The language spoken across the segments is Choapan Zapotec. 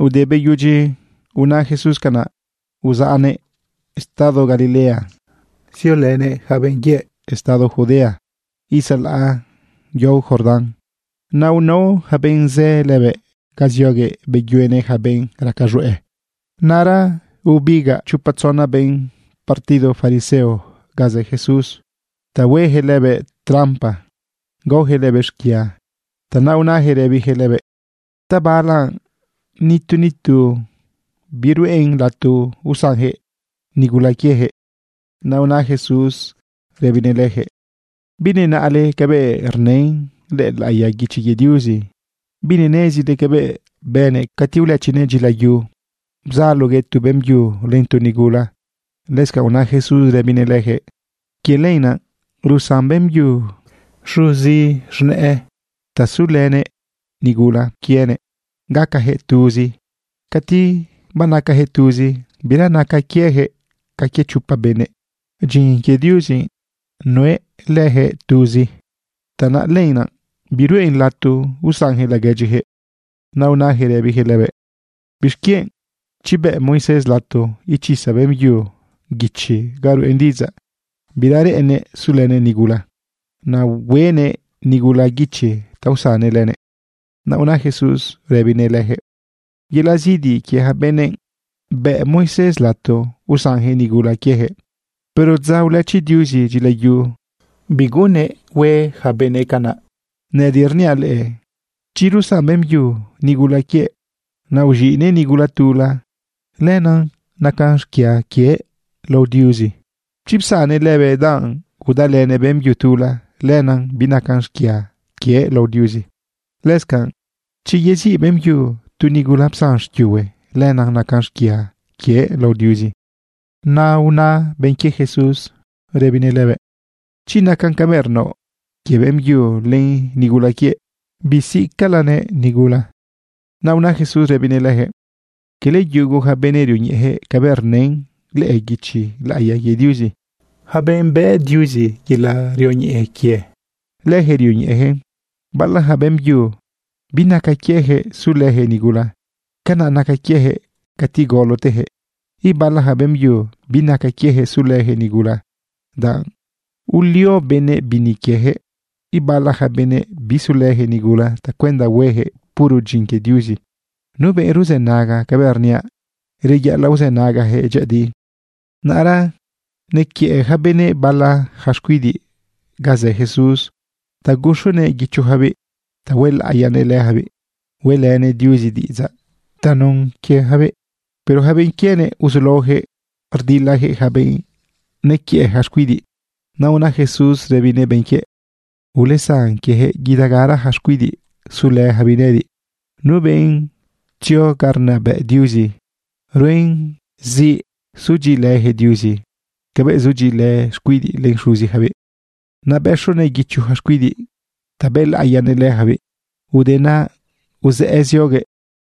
Te beyudyi una Jesús canaꞌ, uzaꞌnëꞌ estado Galilea, ziolënëꞌ yaca benꞌ quiëꞌ estado Judea itzalaꞌ yao Jordán. Naꞌ unao ja benꞌ zë lëbëꞌ ga zioguëꞌ beyuenëꞌ ja benꞌ raca z̃hueꞌ. Naꞌra bebigaꞌ chopa tzona benꞌ partido fariseo ga zë Jesús ta huejëꞌ lëbëꞌ trampa gaojëꞌ lëbëꞌ xquia. Tanaꞌ unajëꞌ rëbijëꞌ lëbëꞌ: ―¿Ta bala nitu nitu biruꞌen lato usanjëꞌ nigula quiejëꞌ? Naꞌ una Jesús rëbinëꞌ lëjëꞌ: ―¿Binenaꞌle cabëꞌ rnë lëꞌë laꞌiya guichi quie Diuzi? ¿Binenezile cabëꞌ bënëꞌ cati ulëchinëꞌ dyilayu, bzaloguëꞌ tu beꞌmbyu len tu nigula? Lëscanꞌ una Jesús rëbinëꞌ lëjëꞌ: ―Quie lenaꞌ rusan beꞌmbyu xuzi z̃nëꞌë ta sulënëꞌ nigula quienëꞌ, gacajëꞌ tuzi. Cati banacajëꞌ tuzi, bira naca quiejëꞌ ca quie chopa benëꞌ. Dyin quie Diuzi nuelëjëꞌ tuzi. Tanaꞌ lenaꞌ biruꞌen lato usanjëꞌ laguedyijëꞌ. Naꞌ unajëꞌ rëbijëꞌ lëbëꞌ: ―¿Bixquienꞌ, chiꞌ, bëꞌ Moisés lato ichisa beꞌmbyu guichi ga rueꞌn diꞌidzaꞌ bira reꞌennëꞌ sulënëꞌ nigula? Naꞌ hueꞌnëꞌ nigula guichi ta usannëꞌ lënëꞌ. Naꞌ una Jesús rëbinëꞌ lëjëꞌ: ―Yelaꞌ zidi quie ja benëꞌ bëꞌ Moisés lato usanjëꞌ nigula quiejëꞌ. Pero dza ulëchi Diuzi dyilayu, biguꞌunnëꞌ hue yaca benëꞌ canaꞌ. Nëꞌëdiꞌ rniaꞌ leꞌe, chi rusan beꞌmbyu nigula quiëꞌ, naꞌ uz̃iꞌnëꞌ nigula tula, lenaꞌ nacan xquia quiëꞌ lao Diuzi. Chi psannëꞌ lëbëꞌ danꞌ udalënëꞌ beꞌmbyu tula, lenaꞌ binacan xquia quiëꞌ lao Diuzi. Lëscanꞌ chi yeziꞌ beꞌmbyu tu nigula psan xquiuhue, lenaꞌ nacan xquia quiëꞌ lao Diuzi. Naꞌ una benꞌ quie Jesús rëbinëꞌ lëbëꞌ: ―Chi nacan cabëꞌ rnaoꞌ quie beꞌmbyu len nigula quienëꞌ, bisiꞌcalanëꞌ nigula. Naꞌ una Jesús rëbinëꞌ lëjëꞌ: ―Quele yugu ja benëꞌ rioñeꞌejëꞌ cabëꞌ rnë lëꞌë guichi laꞌiya quie Diuzi. Yaca benꞌ bëꞌ Diuzi yelaꞌ rioñeꞌe quie, lëjëꞌ rioñeꞌejëꞌn. Bala ja beꞌmbyu binaca quiejëꞌ sulëjëꞌ nigula. Canaꞌ naca quiejëꞌ cati golotejëꞌ. Ibala ja beꞌmbyu binaca quiejëꞌ sulëjëꞌ nigula, danꞌ ulio benëꞌ bini quiejëꞌ. Ibala ja benëꞌ bisulëjëꞌ nigula tacuenda huejëꞌ puro dyin quie Diuzi. Nu benꞌ ruzënaga cabëꞌ rniaꞌ, reyaꞌalaꞌ uzënagajëꞌ dyëꞌëdi. Naꞌra nequiëꞌ ja benëꞌ bala ja xcuidiꞌ ga zë Jesús ta guxonëꞌ guichojabiꞌ ta huelaꞌiyanëꞌ lëjabiꞌ hueꞌlënëꞌ Diuzi diꞌidzaꞌ tanun quiejabiꞌ. Pero ja benꞌ quienëꞌ uzulaojëꞌ rdilajëꞌ ja benꞌ nequiëꞌ ja xcuidiꞌ. Naꞌ una Jesús rëbinëꞌ benꞌ quiëꞌ: ―Ulesan quiejëꞌ. Guidagara ja xcuidiꞌ sulëjabiꞌ nëꞌëdiꞌ. Nu benꞌ tzio ga rnabëꞌ Diuzi ruen zi sudyiꞌilëjëꞌ Diuzi cabëꞌ rzudyiꞌilë xcuidiꞌ len xuzijabiꞌ. Naꞌ bëxonëꞌ guicho ja xcuidiꞌ ta bëlaꞌiyanëꞌ lëjabiꞌ. Ude naꞌ uzëꞌë zioguëꞌ.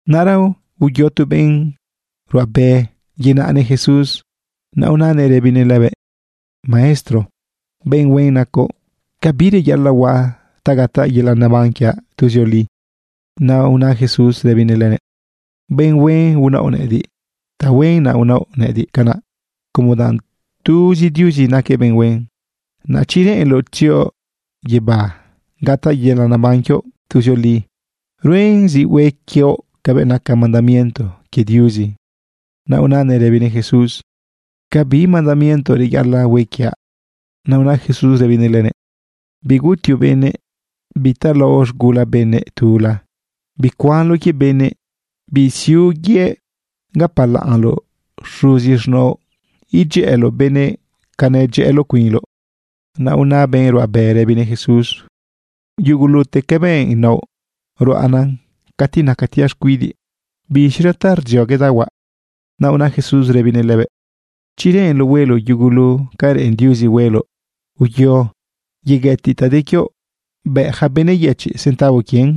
Naꞌra uyo tu benꞌ ruꞌabe yenaꞌnëꞌ Jesús. Naꞌ unanëꞌ rëbinëꞌ lëbëꞌ: ―Maestro, benꞌ huen nacoꞌ. ¿Ca bi reyaꞌalaꞌ huaꞌ ta gataꞌ yelaꞌ neban quiaꞌ tuzioli? Naꞌ una Jesús rëbinëꞌ lënëꞌ: ―Benꞌ huen unaoꞌ nëꞌëdiꞌ. Tahuen naꞌ unaoꞌ nëꞌëdiꞌ canaꞌ, como danꞌ tuzi Diuzi naquëꞌ benꞌ huen. Naꞌ chi reꞌenloꞌ tzioꞌ guibá gataꞌ yelaꞌ neban quioꞌ tuzioli, ruen zi hue quioꞌ cabëꞌ naca mandamiento quie Diuzi. Naꞌ unanëꞌ rëbinëꞌ Jesús: ―¿Ca bi mandamiento reyaꞌalaꞌ hue quiaꞌ? Naꞌ una Jesús rëbinëꞌ lënëꞌ: ―Bigutioꞌ benëꞌ, bitalaoꞌ z̃gula benꞌ tula, bicuanloꞌ quie benëꞌ, bisiuꞌ yëꞌ. Gapalaꞌnloꞌ xuzi z̃naoꞌ, edyëꞌëloꞌ benëꞌ ca nedyëꞌëloꞌ cuinloꞌ. Naꞌ una benꞌ ruꞌabe rëbinëꞌ Jesús: ―Yugulute cabëꞌ naoꞌ, ruaꞌnan cati nacatiaꞌ xcuidiꞌ. ¿Biz̃ira ta rdzioguedaꞌ huaꞌ? Naꞌ una Jesús rëbinëꞌ lënëꞌ: ―Chi reꞌenloꞌ hueloꞌ yugulu ca reꞌen Diuzi hueloꞌ, uyo yeguëtiꞌ ta de quioꞌ, bëꞌ ja benꞌ yëchiꞌ centavo quien.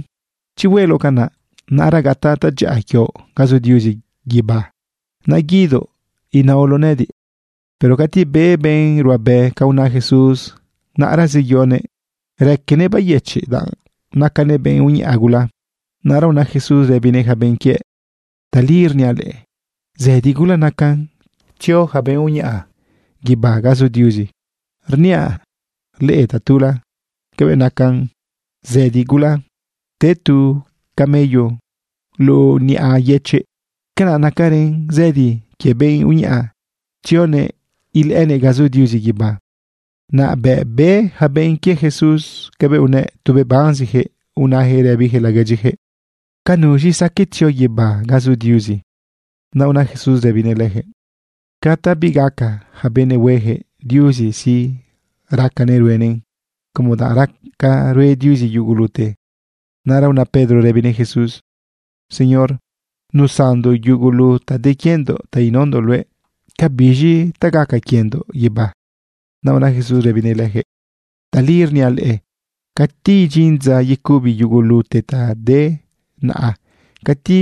Chi hueloꞌ canaꞌ, naꞌra gataꞌ tadyaꞌa quioꞌ ga zu Diuzi guibá. Naꞌ guidoꞌ inaoloꞌ nëꞌëdiꞌ. Pero cati be benꞌ ruꞌabe ca una Jesús, naꞌra zeyonëꞌ raquenëꞌ bayëchiꞌ danꞌ nacanëꞌ benꞌ uñaꞌa gula. Naꞌra una Jesús rëbinëꞌ ja benꞌ quiëꞌ: ―Tali rniaꞌ leꞌe, zëdi gula nacan tzio yaca benꞌ uñaꞌa guibá ga zu Diuzi. Rniaꞌ leꞌe tatula, cabëꞌ nacan zëdi gula te tu camello luꞌu niꞌa yëchiꞌ, canaꞌ nacarën zëdi quie benꞌ uñaꞌa tzionëꞌ ilëꞌënëꞌ ga zu Diuzi guibá. Naꞌ bëꞌ be ja benꞌ quie Jesús cabëꞌ unëꞌ, tu bebanzijëꞌ unajëꞌ rëbijëꞌ laguedyijëꞌ: ―¿Ca nuz̃i saqueꞌ tzio guibá ga zu Diuzi? Naꞌ unaꞌ Jesús rëbinëꞌ lëjëꞌ: ―Ca ta bigaca ja benëꞌ huejëꞌ, Diuzi sí, racanëꞌ ruenëꞌn como danꞌ raca rue Diuzi yugulute. Naꞌra una Pedro rëbinëꞌ Jesús: ―Señor, nusandoꞌ yugulu ta de quiendoꞌ ta inaondoꞌ luëꞌ. ¿Ca biz̃i ta gaca quiendoꞌ guibá? Naꞌ una Jesús rëbinëꞌ lëjëꞌ: ―Tali rniaꞌ leꞌe, cati idyin dza yecubi yugulute ta de naꞌa, cati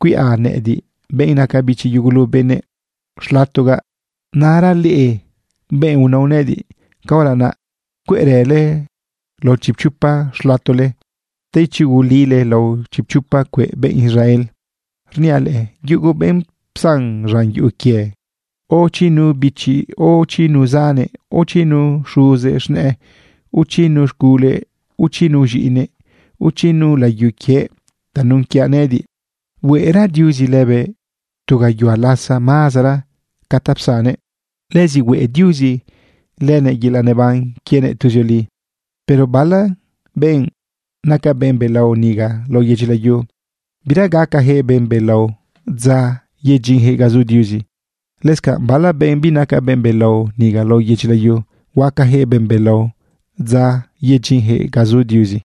cuiꞌa nëꞌëdiꞌ, benꞌ naca bichi yugulu benëꞌ, xlatogaꞌ, naꞌra leꞌe, benꞌ unao nëꞌëdiꞌ, caora naꞌ cueꞌrële lao chipchopa xlatole ta ichugulile lao chipchopa cueꞌ benꞌ Israel. Rniaꞌ leꞌe, yugu benꞌ psan z̃an yuꞌu quie, o chi nu biche, o chi nu zane, o chi nu xuze z̃nëꞌë, o chi nu z̃gule, o chi nu z̃iꞌine, o chi nu layu quie tanun quiaꞌ nëꞌëdiꞌ, hueꞌra Diuzi lëbëꞌ tu gayuhua lasa mazara ca ta psannëꞌ. Lëzi hueꞌ Diuzi lënëꞌ yelaꞌ neban quienëꞌ tuzioli. Pero bala benꞌ naca benꞌ belao niga lao yedyi layu, bira gacajëꞌ benꞌ belao dza yedyinjëꞌ ga zu Diuzi. Lëscanꞌ bala benꞌ binaca benꞌ belao niga lao yedyi layu, huacajëꞌ benꞌ belao dza yedyinjëꞌ ga zu Diuzi.